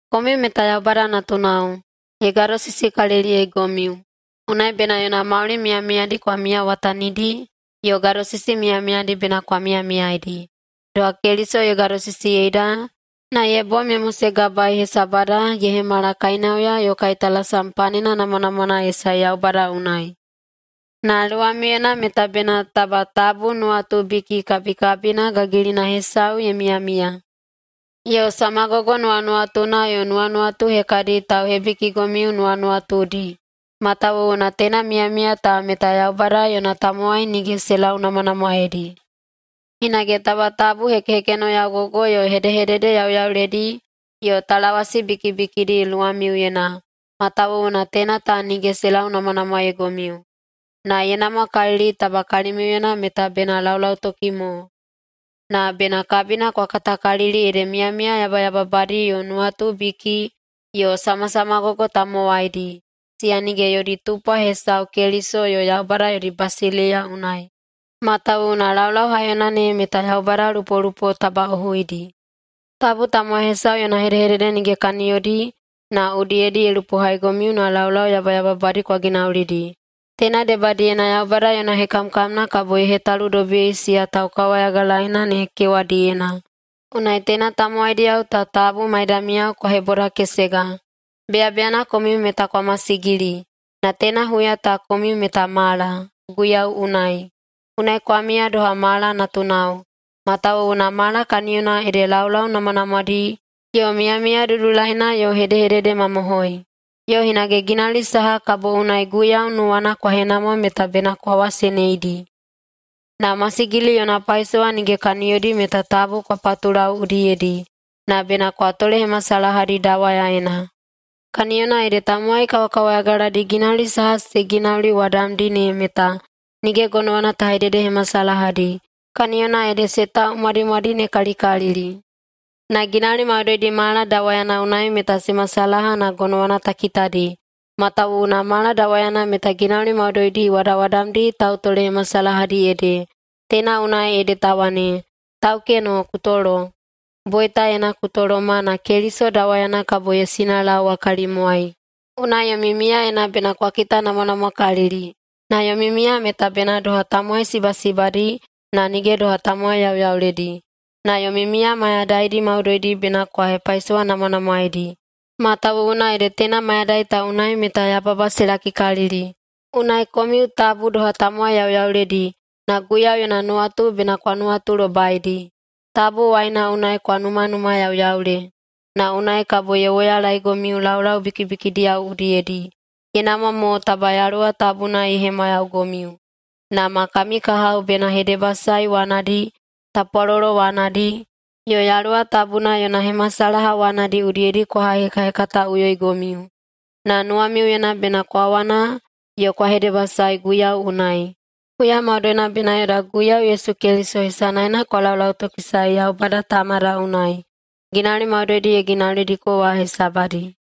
Komiu meta Yaubada natunao, ye gadosisikaliliyeigomiu. Unai bena yona mauli miyamiyadi kwa miyawatanidi yo gadosisi miyamiyadi bena kwa miyamiyaidi, doha Keliso ye gadosisiyeida na ye bom ye mosegabaei hesabada ye hemala kainauya yo kaitalasam panena namwanamwana ye sae Yaubada unai. Na luwamiuyena meta bena taba tabu nuwatubiki kabikabina gagilina hesau ye miyamiya, yo samagogo nuwanuwatuna yo nuwanuwatu hekadi tauhebikigomiu nuwanuwatudi, matawuwuna teina miyamiya ta meta Yaubada yona tamowai nige se launamwanamwaeidi. Hinage taba tabu hekehekenoyaugogo yo hedehedede yauyauledi yo talawasi bikibikidi luwamiuyena, matawuwuna teina ta nige se launamwanamwaeigomiu. Na ye namwakalili taba kalimiuyena meta bena laulautoki mo. Na bena kabina kwa katakalili ede miyamiya yabayababadi yo nuwatubiki yo samasamagogo tamowaidi, siya nige yodi tupwa hesau Keliso yo Yaubada yodi basileiya unai. Matawuwuna laulau haiyona ne meta yaubada lupolupo tabaꞌohuidi. Tabu tamowai hesau yona hedehedede nige kaniyodi na udiyedi ye lupohaigomiu na laulau yabayababadi kwa ginaulidi. Teina debadiyena Yaubada yona hekamkamna kabo ye hetaludobiyei siya taukawayagalaeina ne kewadiyena. Unai teina tamowaidiyao ta tabu maidamiyao kwa hebodakesega. Beyabeyana komiu meta kwa masigili, na teina huya ta komiu meta mala, Guiyau unai. Unai kwa miya doha mala natunao. Matawuwuna mala kaniyona ede laulau namwanamwadi yo miyamiya dudulaina yo hedehededemamohoi. Yo hinage ginauli saha kabo unai Guiyau nuwana kwa henamwa meta bena kwa waseneidi. Na masigili yona paisowa nige kaniyodi meta tabu kwa patulau udiyedi, na bena kwa tolehemasalahadi dawayaena. Kaniyona ede tamowai kawakawayagaladi ginauli saha se ginauliwadamdi ne meta nige gonowana ta hededehemasalahadi, kaniyona ede se taumwadimwadinekalikalili. Na ginauli maudoidi mala dawayana unai meta se masalaha na gonowana ta kitadi matawuwuna mala dawayana meta ginauli maudoidi wadawadamdi tautolehemasalahadi ede. Teina unai ede ta wane, “Taukeno, ku tolo, boitaena ku toloma na Keliso dawayana kabo ye sinalaowa kalimwai.” Unai yomi miyaena bena kwa kitanamwanamwakalili, na yomi miya meta bena doha tamowai sibasibadi na nige doha tamowai yauyauledi. Na yomi miya mayadaidi maudoidi bena kwa hepaisowanamwanamwaedi, matawuwuna ede teina mayadai ta unai meta yababa se lakikalili. Unai komiu tabu doha tamowai yauyauledi, na Guiyau yona nuwatu bena kwa nuwatulobaidi. Tabu waina unai kwa numanumayauyaule na unai kabo ye woyalaegomiu laulau bikibikidiyao udiyedi. Ye namwa mo taba Yaluwa Tabuna ye hemwayaugomiu, na ma kami kahao bena hedebasae wanadi, tapwalolo wanadi, yo Yaluwa Tabuna yona hemasalaha wanadi udiyedi kwa haihekahekataꞌuyoigomiu. Na nuwamiuyena bena kwa wana yo kwa hedebasae Guiyau unai. Huya maudoina bena yoda Guiyau Yesu Keliso hesanaena kwa laulautokisae Yaubada Tamada unai, ginauli maudoidi ye ginaulidiko wa hesabadi.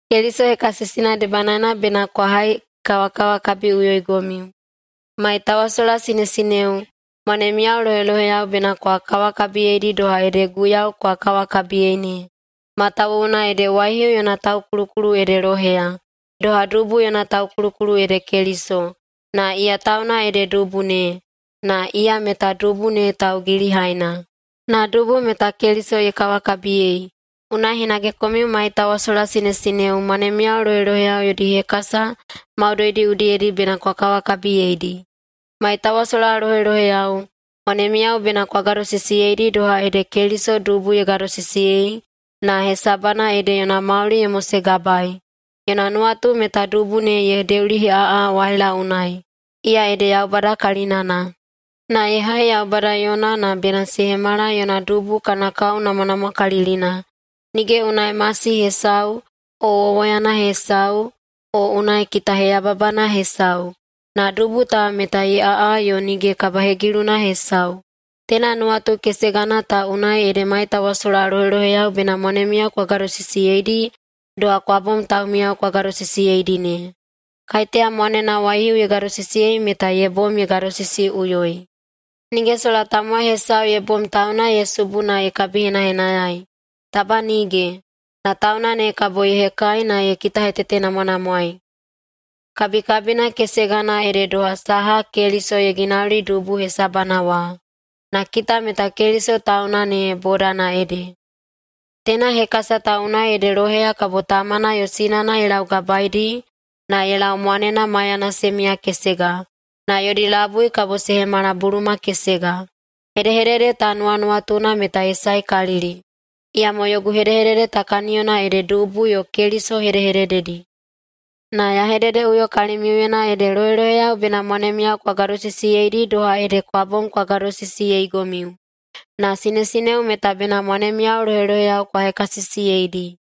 Keliso hekasisina debanaena bena kwa haikawakawakabiꞌuyoigomiu. Maitawasola sinesineo, mwanemiyao loheloheyao bena kwa kawakabiyeidi doha ede Guiyau kwa kawakabiyei ne. Matawuwuna ede waihiu yona taukulukulu ede loheya, doha dubu yona taukulukulu ede Keliso. Na iya tauna ede dubu ne, na iya meta dubu ne taugilihaina. Na dubu meta Keliso ye kawakabiyei, unai hinage komiu maitawasola sinesineo mwanemiyao loheloheyao yodi hekasa maudoidi udiyedi bena kwa kawakabiyeidi. Maitawasola loheloheyao, mwanemiyao bena kwa gadosisiyeidi doha ede Keliso dubu ye gadosisiyei na hesabana ede yona mauli ye mosegabaei. Yona nuwatu meta dubu ne ye deuliheꞌaꞌa waila unai, iya ede Yaubada kalinana, na ye hai Yaubada yona na bena se hemala yona dubu kana kao namwanamwakalilina, nige unai masi hesau o wowoyana hesau o unai kitaheyababana hesau, na dubu ta meta ye aꞌa yo nige kabahegiluna hesau. Teina nuwatu kesegana ta unai ede maitawasola loheloheyao bena mwanemiyao kwa gadosisiyeidi doha kwa bom taumiyao kwa gadosisiyeidi ne. Kaiteya mwanena waihiu ye gadosisiyei meta ye bom ye gadosisiyeiꞌuyoi. Nige sola tamowai hesau ye bom tauna ye subu na ye kabihenahenayai. Taba nige! Na tauna ne kabo ye hekai na ye kitahetetenamwanamwaei. Kabikabina kesegana ede doha saha Keliso ye ginauli dubu hesabana wa. Na kita meta Keliso tauna ne bodana ede. “Teina hekasa ta unai ede loheya kabo tamana yo sinana ye laugabaedi na ye lau mwanena maiyana se miyakesega, na yodi labui kabo se hemala buluma kesega.” Hedehedede ta nuwanuwatuna meta ye saekalili, iyamo yogu hedehedede ta kaniyona ede dubu yo Keliso hedehedededi. Na ya hededeꞌuyo kalimiuyena ede loheloheyao bena mwanemiyao kwa gadosisiyeidi doha ede kwa bom kwa gadosisiyeigomiu, na sinesineo meta bena mwanemiyao loheloheyao kwa hekasisiyeidi.